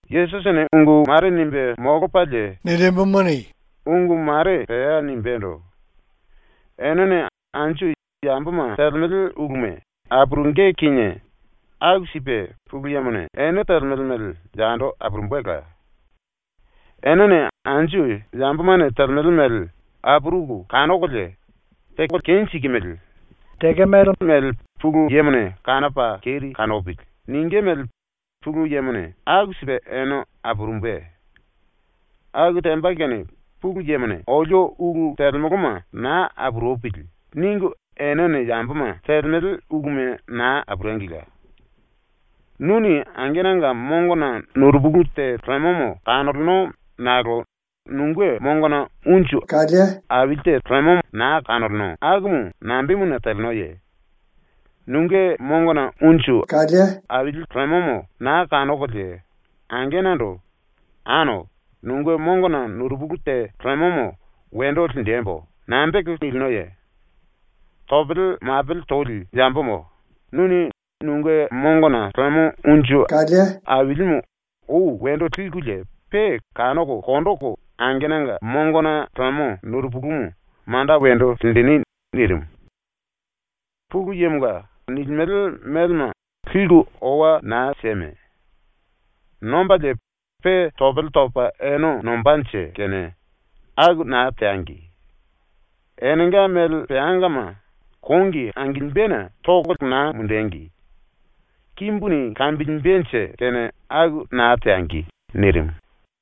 ⸤Yesusini ungu mare nimbe molopalie ungu mare pea nimbendo:⸥ “Enene anju yamboma ⸤telemele uluma⸥ apurungí kinie aku sipe ⸤Pulu Yemone⸥ ene telemele mele yando apurumbela. Enene anju yambomane telemele mele apuruku kanokolie “Teko kenjikimili. Tekemele mele Pulu Yemone kanopa keri kanopili.” ningí mele ⸤Pulu Yemone⸥ aku sipe ene apurumbe. Aku temba kene ‘⸤Pulu Yemone⸥ olio ulu telemoloma naa apurupili.’ ningu enene yamboma telemele uluma naa apurengila. “Nuni angenanga mongona nurupulu te lemo kanoleno nakolo nunge mongona unju aili te lemomo naa kanoleno akumu nambemuna telenoye? Nunge mongona unju aili lemomo naa kanokolie angenando “Ano, nunge mongona nurupulu te lemomo wendo linjembo.” nambe teko nilinoye? Topele mapele toli yambomo, nuni nunge mongona lemo unju ailimu ou wendo likulie pe kanoko konjiku angenanga mongona lemo nurupulumu manda wendo linjini.” ⸤nirimu.⸥ “‘Pulu Yemonga’ nilimele melema liku owa naa sieme. Nombalie pe topele topa ene nombanje kene aku naa teangi. Enenga mele peangama kongi angilimbena toko naa mundengi. Kimbuni kambilimbenje kene aku naa teangi.” ⸤nirimu.⸥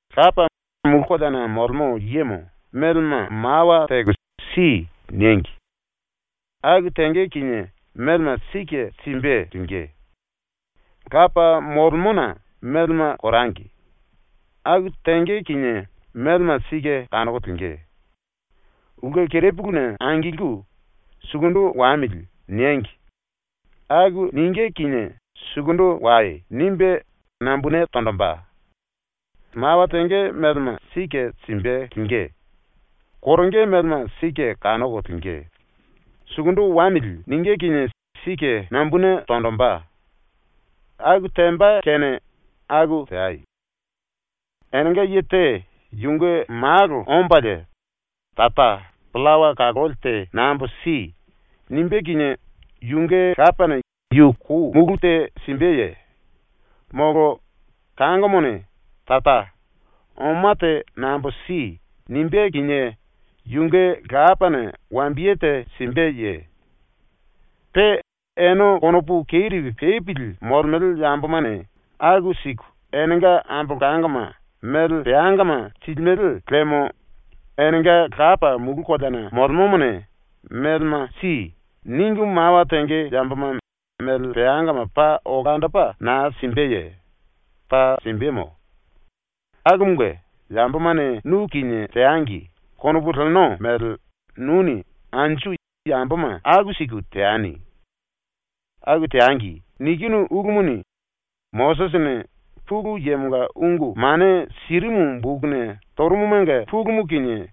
“⸤Lapa, mulu koleana molemo yemo⸥ melema mawa teko “Si.” niengi. Aku tenge kinie melema sike simbe lingí. ⸤Lapa molemona⸥ melema korangi. Aku tenge kinie melema sike kanoko lingí. Ulke kerepuluna angilku “Sukundu wamili.” niengi. Aku ningí kinie “Sukundu wai.” nimbe nambune tonjimbe. Mawa tenge melema sike simbe lingí, koronge melema sike kanoko lingí, “Sukundu wamili.” ningí kinie sike nambune tonjimbe. Aku temba kene aku teai. “Enenga ye te yunge malo ombalie “Tara, pillawa kaloli te nambo si.” nimbé kinie yunge lapane yu kou mulú te simbeye? Molo kangomone “Tara, oma te nambo si.” nimbé kinie yunge lapane wambiye te simbeye? Pe ene konopu keri pepili molemele yambomane aku siku enenga ambolangoma mele peangama silimele liemo enenga Lapa mulu koleana molemomone “Melema si.” ningu mawa tenge yamboma mele peangama paa olandopa na simbeye? ⸤Paa simbemo.⸥ Akumunge, ‘Yambomane nu kinie teangi.’ konopu leno mele nuni anju yamboma aku siku teani. ‘Aku teangi.’ nikinu ulumuni Mosisini Pulu Yemonga ungu mane sirimu bokuna torumumanga pulumu kinie,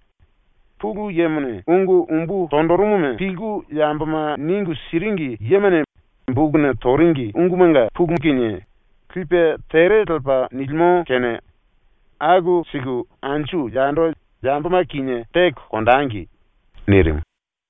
Pulu Yemone ungu umbu tonjirimuma pilku yamboma ningu siringi yemane bokuna toringi ungumanga pulumu kinie, lipe tere lepa nilimo kene aku siku anju yando yamboma kinie teko konjengi.” ⸤nirimu.⸥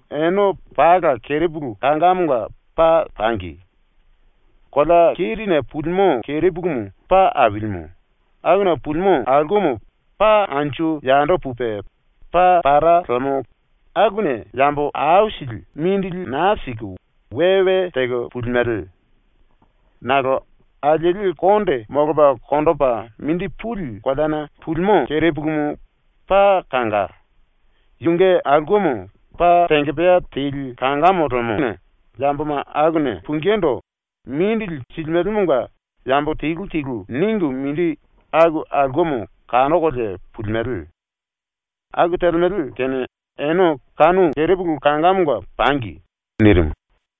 “Ene pala kerepulu kangamonga paa pangi. Kolea kerine pulimo kerepulumu paa ailimu, akuna pulimo aulkemo paa anju yando pupe paa pará lemo akuna yambo aisili mindili naa siku we we teko pulimele. Nakolo alieli konde molopa konjipe mindi puli koleana pulimo kerepulumu paa kanga, yunge aulkemo paa tengepea teli kangamo lemona yamboma akuna pungindu mindili silimelemonga yambo telu telu ningu mindi aku aulkemo kanokolie pulimele. Aku telemele kene ene kanu kerepulu kangamonga pangi.” ⸤nirimu.⸥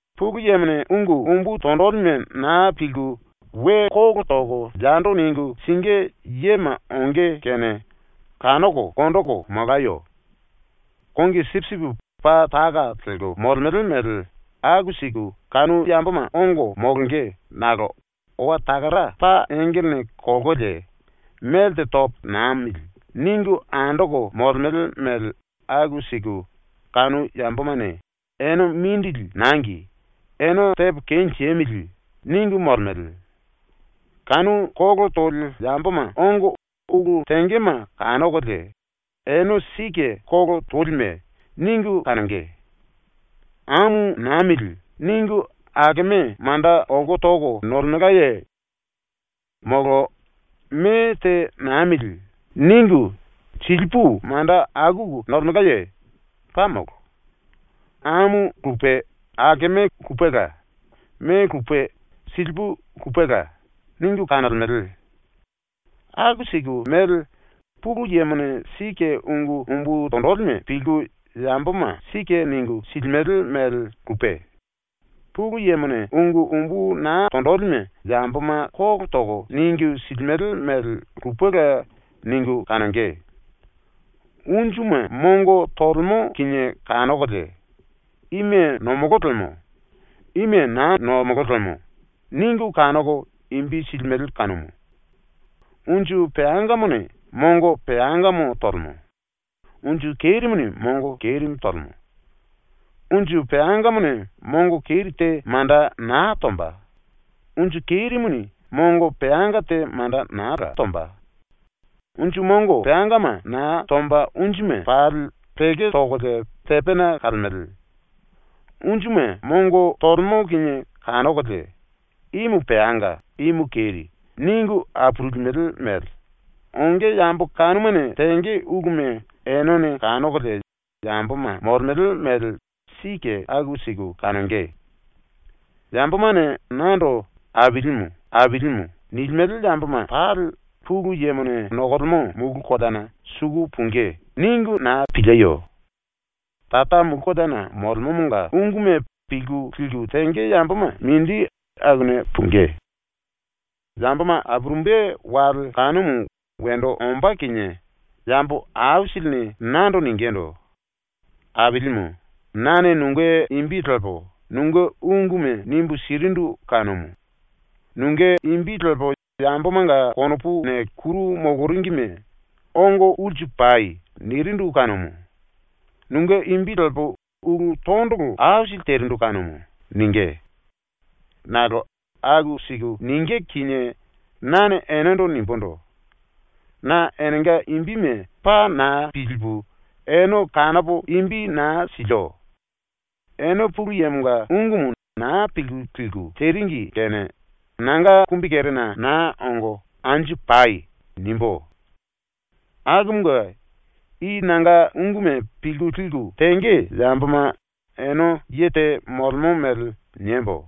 “Pulu Yemone ungu umbu tonjilime na pilku we kolo toko yando ningu singí yema onge kene kanoko konjiku molayo. Kongi sipisipi paa taka lelko molemele mele aku siku kanu yamboma ongo molonge nakolo owa takara paa engelene kolkolie ‘Melte topo namili.’ ningu andoko molemele mele aku siku kanu yambomane ‘Ene mindili nangi. Ene tepo kenjemili.’ ningu molemele. Kanu kolo toli yamboma ongo ulu tengema kanokolie, ‘Ene sike kolo tolime.’ ningu kanonge. ‘Amu namili.’ ningu takeme manda olko toko nolemelkaye? Molo ‘Me te namili.’ ningu silipu manda akuku nolemelkaye? Paa molo. ‘Amu lupe takeme lupela, me lupe silipu lupela.’ ningu kanolemele. ⸤Aku siku mele Pulu Yemone sike ungu umbu tonjilime pilku yamboma sike ningu silimele mele lupe, Pulu Yemone ungu umbu na tonjilime yamboma kolo toko ningu silimele mele lupela ningu kanonge.⸥ Unjuma mongo tolemo kinie kanokolie ‘Ime nomolo lemo. Ime naa nomolo lemo.’ ningu kanoko imbi silimele kanumu. Unju peangamone mongo peangamo tolemo; unju kerimuni mongo kerimu tolemo. Unju peangamone mongo keri te manda naa tomba; unju kerimuni mongo peanga te manda naa tombala. Unju mongo peangama naa tomba unjuma pali peko tokolie tepena kalemele. Unjuma mongo tolemo kinie kanokolie, “Imu peanga, imu keri.” ningu apurulimele mele, onge yambo kanumane tenge uluma enene kanokolie yamboma molemele mele sike aku siku kanonge. “‘Yambomane nando ‘Ailimu.’ nilimele yamboma pali Pulu Yemone nokolemo mulu koleana suku pungí.’ ningu na pilieyo. Tara mulu koleana molemomonga unguma pilku liku tenge yamboma mindi akuna pungí. Yamboma apurumbe wale kanumu wendo ombá kinie yambo aisilini nando ningindu: “Ailimu, nane nunge imbi lepo nunge unguma nimbu sirindu kanumu; nunge imbi lepo yambomanga konopuna kuru moloringime “Ongo ulsu pai.” nirindu kanumu; nunge imbi lepo ulu tondolo aisili terindu kanumu.” ningí. Nakolo aku siku ningí kinie nane enendo nimbundu: “Na enenga imbime paa na pilipu ene kanopo imbi naa silio. Ene Pulu Yemonga ungumu na pilku liku teringi kene nanga kumbikerena naa ongo anju pai.” nimbú. “Akumunge, i nanga unguma pilku liku tenge yamboma ene ye te molemo mele niembo: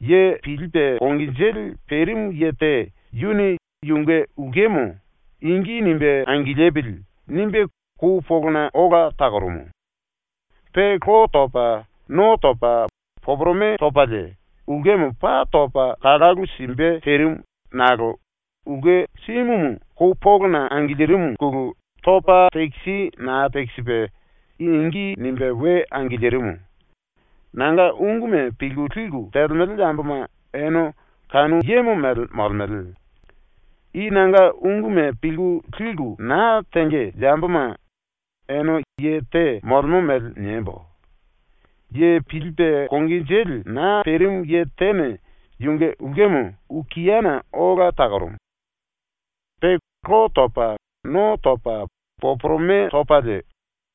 Ye pilipe konginjili perimu ye te yuni yunge ulkemo ‘Ingi nimbe angilipili.’ nimbe kou polona ola takorumu. Pe lo topa no topa poporome topalie ulkemo paa topa kalalu simbe terimu nakolo ulke simumu kou polona angilirimuna topa tekisi naa tekisipe ingi nimbe we angilirimu. Nanga unguma pilku liku telemele yamboma ene kanu yemo mele molemele. “I nanga unguma pilku liku na tenge yamboma ene ye te molemo mele niembo: Ye pilipe konginjili naa perimu ye tene yunge ulkemo okiana ola takorumu. Pe lo topa no topa poporome topalie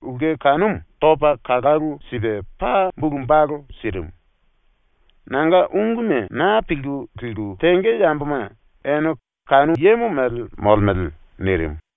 ulke kanumu topa kalalu sipe paa bulu balu sirimu. Nanga unguma na pilku liku tenge yamboma ene kanu yemo mele molemele.” nirimu.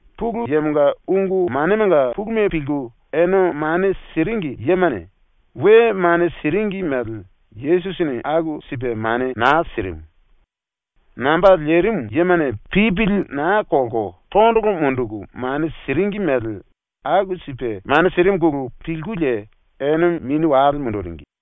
Pulu Yemonga ungu manemanga puluma pilku ene mane siringi yemane we mane siringi mele Yesusini aku sipe mane naa sirimu. Namba lerimu yemane pipili naa kolko tondolo munduku mane siringi mele aku sipe mane sirimuna pilkulie ene mini wale munduringi.